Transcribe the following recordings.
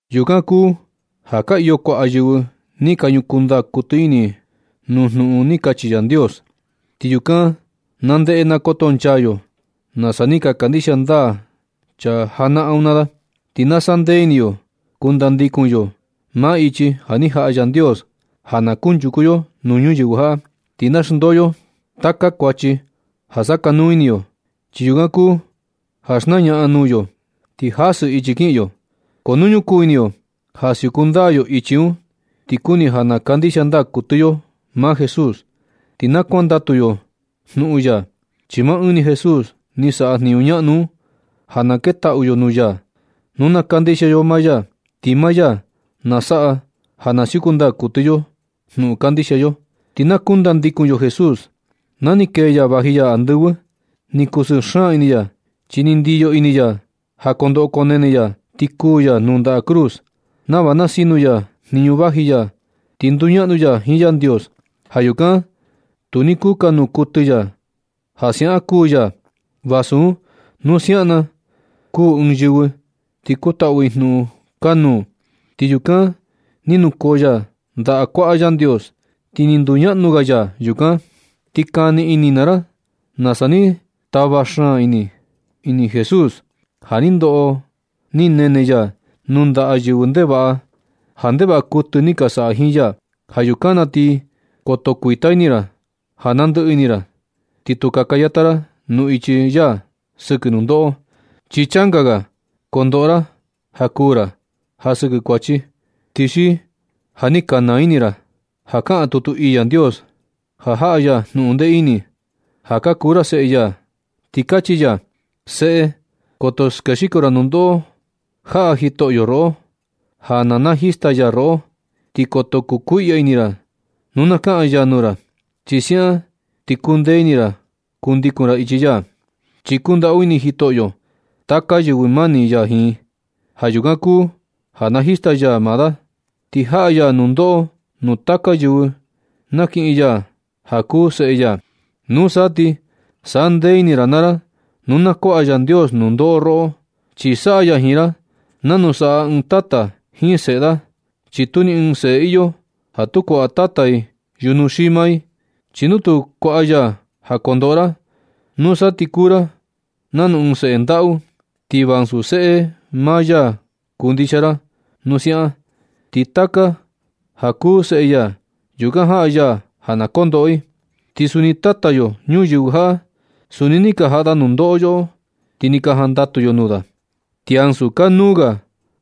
Yukan kuu ja ka iyo kuaꞌa yɨvɨ ni ka ñukuu ndaa kuɨtɨ ini nuu jnuꞌun ni kachi Yandios, ti yukan na ndeꞌe na koto nchaa yo nasa ni ka kandixia ndaa chaa janaꞌan un naa da. Ti na sandee ini yo kundandikun yo maa ichi ja ni jaꞌa Yandios ja na kunchuku yo nuu ñuyɨvɨ jaꞌa. Ti na xndoo yo taka kuachi ja sakanuu ini yo, chi yukan kuu ja xnañaꞌan nuu yo ti jasɨ ichi kiꞌin yo. Ko nu ñukuu ini yo ja siuku ndaa yo ichi un, ti kuni ja na kandixia ndaa kuɨtɨ yo maa Jesús ti na kuandatu yo jnuꞌun ya. Chi maa ɨɨn ni Jesús ni saꞌa jniñu ñaꞌnu un ja na ketaꞌu yo nuu ya nu na kandixia yo maa ya, ti maa ya na saꞌa ja na siuku ndaa kuɨtɨ yo jnuꞌun kandixia yo. Ti na kundandikun yo Jesús. Na ni kee ya vaji ya andɨvɨ, ni kusɨɨ xaan ini ya, chi ni ndiyo ini ya ja kondoꞌo konene ya ti kuu ya nuu ndaꞌa cruz nava na sinu ya jniñu vaji ya ti nduñaꞌnu ya jiin Yandios. Ja yukan tu ni kukanuu kuɨtɨ ya ja siaꞌan kuu ya, vasu un nu siaꞌan na kuu ɨɨn yɨvɨ ti kutaꞌu i jnuꞌun kanuu. Ti yukan ni nukoo ya ndaꞌa kuaꞌa Yandios ti ni nduñaꞌnu ga ya yukan. Ti kani ini naa ra nasa ni tava xaan ini Jesús ja ni ndoꞌo ni nene ya nuu ndaꞌa yɨvɨ ndevaꞌa ja ndevaꞌa kuɨtɨ ni ka saꞌa i jiin ya. Ja yukan na ti koto kuita ini ra ja nandɨꞌɨ ini ra. Ti tu kaka yata ra nuu ichi ya sɨkɨ nundoꞌo. Chi changa ga kondoꞌo ra ja kuu ra ja sɨkɨ kuachi. Ti xi ja ni ka naa ini ra naa ra ja kaꞌan tutu ii Yandios ja jaꞌa ya jnuꞌun ndee ini, ja ka kuu ra seꞌe ya, ti kachi ya: Seꞌe, koto skexiko ra nundoꞌo jaꞌa Jitoꞌo roꞌo, ja na najista ya roꞌo. Ti koto kukuiꞌya ini ra nu na kaꞌan ya nuu ra, chi siaꞌan ti kuu ndee ini ra kundikun ra ichi ya. Chi kundaꞌu ini Jitoꞌo taka yɨvɨ mani ya jiin, ja yukan kuu ja najista ya i. Ti jaꞌa ya nundoꞌo nuu taka yɨvɨ nakiꞌin ya ja kuu seꞌe ya. Nusa ti sandee ini ra naa ra nu na kuaꞌa Yandios nundoꞌo roꞌo, chi saꞌa ya jiin ra nanu saꞌa ɨɨn tata jiin seꞌe da. Chi tu ni ɨɨn seꞌe iyo ja tu kuaꞌa tata i yujnu xii maa i. Chi nu tu kuaꞌa ya jaa kondoꞌo ra, nusa ti kuu ra nanu ɨɨn seꞌe ndaꞌu, ti va ansu seꞌe maa ya kuu ndixia ra nu siaꞌan. Chi taka ja kuu seꞌe ya yukan jaꞌa ya ja na kondoꞌo i. Ti suni tata yo ñuyɨvɨ jaꞌa, suni ni ka jaꞌa da nundoꞌo yoꞌo, ti sa ni ka jandatu yo nuu da. Ti ansu kanuu ga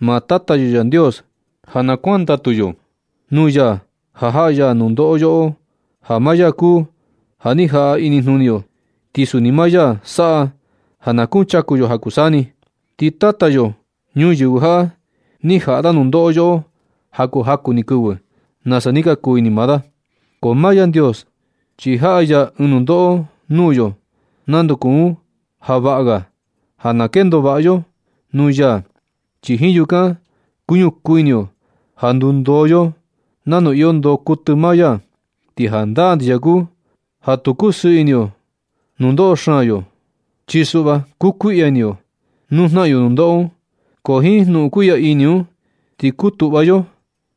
maa Tata yo Yandios ja na kuantaꞌu yo nuu ya ja jaꞌa ya nundoꞌo yoꞌo, ja maa ya kuu ja ni jaꞌa inijnuni yo. Ti suni maa ya saꞌa ja na kuchaku yo ja kuu saa ni. Ti tata yo ñuyɨvɨ jaꞌa, ni jaꞌa da nundoꞌo yoꞌo ja kuu jaku ni kɨvɨ, nasa ni kuu ini maa da. Ko maa Yandios chi jaꞌa ya ɨɨn nundoꞌo nuu yo nanu kuu un ja vaꞌa ga ja na kendo vaꞌa ga yo nuu ya, chi jiin yukan kuñukuu ini yo ja ndundoo yo nanu iyo ndoo kuɨtɨ maa ya. Ti jandaa ndixia kuu ja tu kusɨɨ ini yo nundoꞌo xaan yo un, chi suꞌva kukuiꞌya ini yo nuu jnaꞌan yo nundoꞌo un. Ko jiin jnuꞌun kuiꞌya ini un ti kutuꞌva yo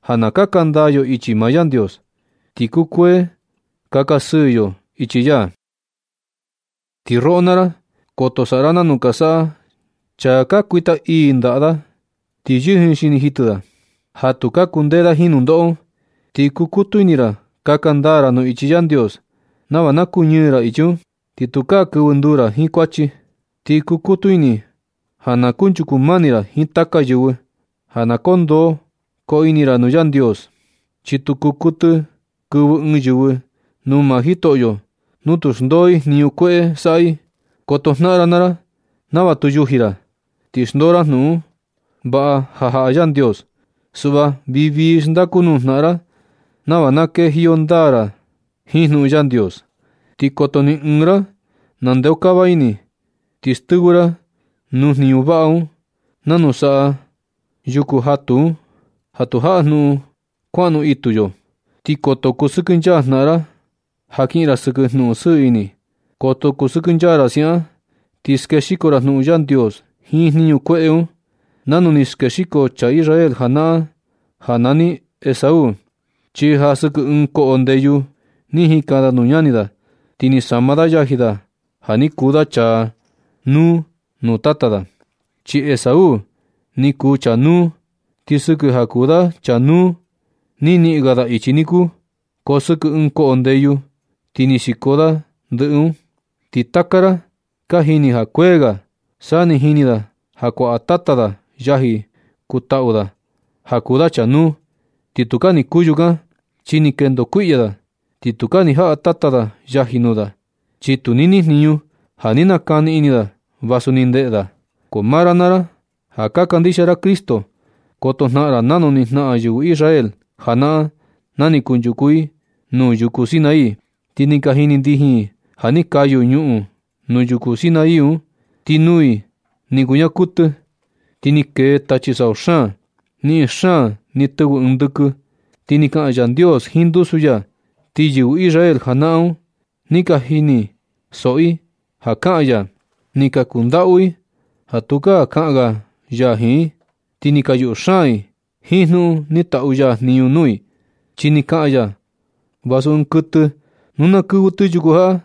ja na kaka ndaa yo ichi maa Yandios, ti kukuee kaka sɨɨ yo ichi ya. Ti roꞌo naa ra, koto saꞌa ra nanu ka saꞌa chaa ja ka kuita ii ndaꞌa da ti yijin xini jitɨ da, ja tu ka kundee da jiin nundoꞌo un. Ti kukutu ini ra kaka ndaa ra nuu ichi Yandios nava na kuñɨɨ ra ichi un, ti tukaa kɨvɨ nduu ra jiin kuachi. Ti kukutu ini ja na kunchuku mani ra jiin taka yɨvɨ, ja na koo ndoo koo ini ra nuu Yandios. Chi tu kuu kuɨtɨ kɨvɨ ɨɨn yɨvɨ nuu maa Jitoꞌo nu tu xndoo i jniñu kueꞌe saꞌa i. Koto jnaꞌan naa ra nava tu yuji ra ti xndoo ra jnuꞌun vaꞌa ja jaꞌa Yandios. Suꞌva vii vii xndaku nuu jnaꞌan ra nava na kendajiyo ndaa na jiin jnuꞌun Yandios. Ti koto ni ɨɨn ra naa ra nandeokava ini ti stɨvɨ ra nuu jniñu vaꞌa un nanu saꞌa yuku jatu un ja tu jaꞌa jnuꞌun kuaꞌnu itu yo. Ti koto kusɨkɨnchaa jnaꞌan ra ja kiꞌin ra sɨkɨ jnuꞌun sɨɨ ini. Koto kusɨkɨnchaa ra siaꞌan ti skexiko ra jnuꞌun Yandios jiin jniñu kueꞌe un, nanu ni skexiko chaa Israel janaꞌan ja nani Esaú. Chi ja sɨkɨ ɨɨn koꞌo ndeyu ni jikan da nuu ñani da, ti ni sama da yaji da ja ni kuu da chaa nuu nuu tata da, chi Esaú ni kuu chaa nuu. Chi sɨkɨ ja kuu da chaa nuu, ni niꞌin ga da ichi niku. Ko sɨkɨ ɨɨn koꞌo ndeyu ti ni xiko da ndɨꞌɨ un. Ti taka ra ka jini ja kuee ga, sa ni jini da ja kuaꞌa tata da yaji kutaꞌu da ja kuu da chaa nuu. Ti tukaa ni kuu yukan, chi ni kendo kuiꞌya da ti tukaa ni jaꞌa tata da yaji nuu da. Chi tu ni nijniñu ja ni nakani ini da, vasu ni ndeꞌe da. Ko maa ra naa ra ja ka kandixia ra Cristo, koto jnaꞌan ra nanu ni jnaꞌan yɨvɨ Israel janaꞌan na ni kunchuku i nuu yuku Sinaí. Ti ni ka jini ndijin i ja ni kayu ñuꞌun nuu yuku Sinaí un, ti nuu i ni kuñaa kuɨtɨ, ti ni kee tachi sau xaan. Niꞌin xaan ni tɨvɨ ɨɨn ndɨkɨ, ti ni kaꞌan Yandios jiin ndusu ya. Ti yɨvɨ Israel janaꞌan un ja ni ka jini soꞌo i ja kaꞌan ya, ni ka kandaꞌu i ja tukaa kaꞌan ga ya jiin i. Ti ni ka yuꞌu xaan i jiin jnuꞌun ni taꞌu ya jniñu nuu i, chi ni kaꞌan ya: “Vasu ɨɨn kuɨtɨ nu na kɨvɨ tɨ yuku jaꞌa,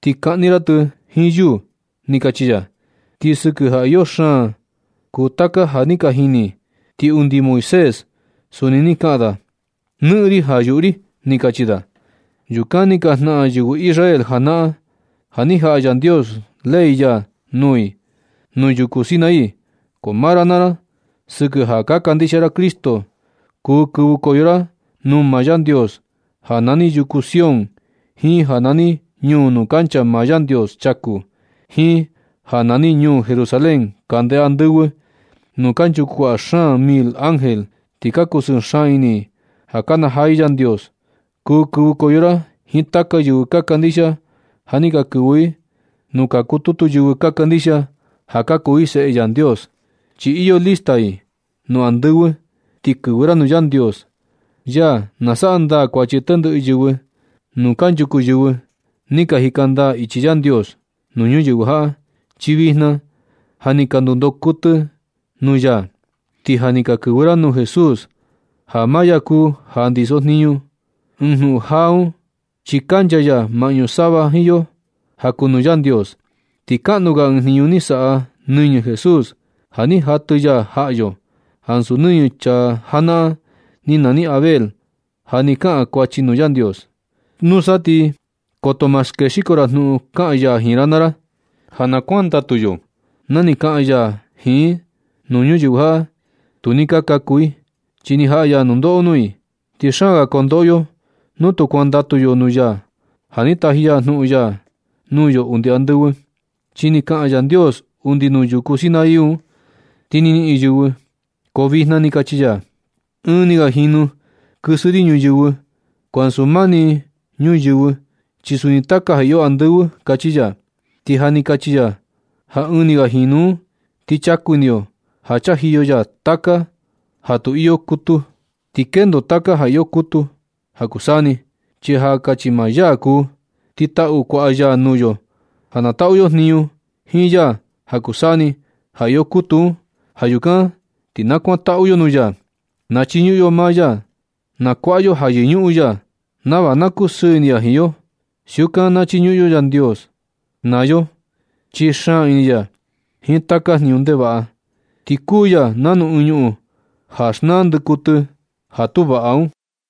ti kaꞌni ra tɨ jiin yuu”, ni kachi ya. Ti sɨkɨ ja iyo xaan kuu taka ja ni ka jini i, ti undi Moisés suni ni kaꞌan da: “Nɨꞌɨn ri ja yuꞌu ri”, ni kachi da. Yukan ni ka jnaꞌan yɨvɨ Israel janaꞌan na ni jaꞌa Yandios ley ya nuu i nuu yuku Sinaí. Ko maa ra naa ra, sɨkɨ ja ka kandixia ra Cristo, kuu kɨvɨkoyo ra nuu maa Yandios ja nani yuku Sión jiin ja nani ñuu nuu kancha maa Yandios chaku jiin ja nani ñuu Jerusalén kande andɨvɨ, nuu kanchuku kuaꞌa xaan mil ángel ti ka kusɨɨ xaan ini i ka kanajaa i Yandios. Kuu kɨvɨkoyo ra jiin taka yɨvɨ ka kandixia ja ni ka kɨvɨ i nuu ka kututu yɨvɨ ka kandixia ja ka kuu i seꞌe Yandios, chi iyo lista i nuu andɨvɨ. Ti kɨvɨ ra nuu Yandios, ya nasaꞌa ndaa kuachi tendɨꞌɨ yɨvɨ, nuu kanchuku yɨvɨ ni ka jika ndaa ichi Yandios nuu ñuyɨvɨ jaꞌa, chi vijna ja ni ka ndundoo kuɨtɨ i nuu ya. Ti ja ni ka kɨvɨ ra nuu Jesús, ja maa ya kuu ja ndiso jniñu ɨɨn jnuꞌun jaa un, chi kancha ya maꞌñu sava jiin yo ja kuu nuu Yandios. Ti kaꞌnu ga ɨɨn jniñu ni saꞌa nɨñɨ Jesús ja ni jatɨ ya jaꞌa yo, ansu nɨñɨ chaa janaꞌan ni nani Abel ja ni kaꞌan kuachi nuu Yandios. Nusa ti koto ma skexiko ra jnuꞌun kaꞌan ya jiin ra naa ra, chi yɨvɨ tu ni ka jandatu na ni kaꞌan ya jiin i nuu ñuyɨvɨ jaꞌa, tu ni ka kaku i, chi ni jaꞌa ya nundoꞌo nuu i. Ti xaan ga ko ndoꞌo yo nu tu kuandatu yo nuu ya ja ni taji ya jnuꞌun ya nuu yo undi andɨvɨ. Chi na ni kaꞌan Yandios undi nuu yuku Sinai un, ni nɨꞌɨn ñuyɨvɨ. Ko vijna chi kachi ya: “Ɨɨn ni ga jinu na kɨsɨ ri ñuyɨvɨ ko ansu maa ni ñuyɨvɨ, chi suni taka ja iyo andɨvɨ”, kachi ya. Ti ja ni kachi ya ja “ɨɨn ni ga jinu un”, ni chaku ini yo ja chajiyo ya taka ja tu iyo kutu, ti kendo taka ja iyo kutu ja kuu saa ni, chi ja kachi maa ya kuu. Ti taꞌu kuaꞌa ya nuu yo ja na taꞌu yo jniñu jiin ya ja kuu saa ni, ja iyo kutu un. Ja yukan ti na nakuantaꞌu yo nuu ya, na chiñuꞌun yo maa ya, na kuaꞌa yo ja yɨñuꞌun ya, nava na kusɨɨ ini ya jiin yo. Siukan na chiñuꞌun yo Yandios naa yo, chi xaan ini ya jiin taka jniñu ndevaꞌa, ti kuu ya nanu ɨɨn ñuꞌun ja xnaa ndɨkuɨtɨ ja tu vaꞌa un.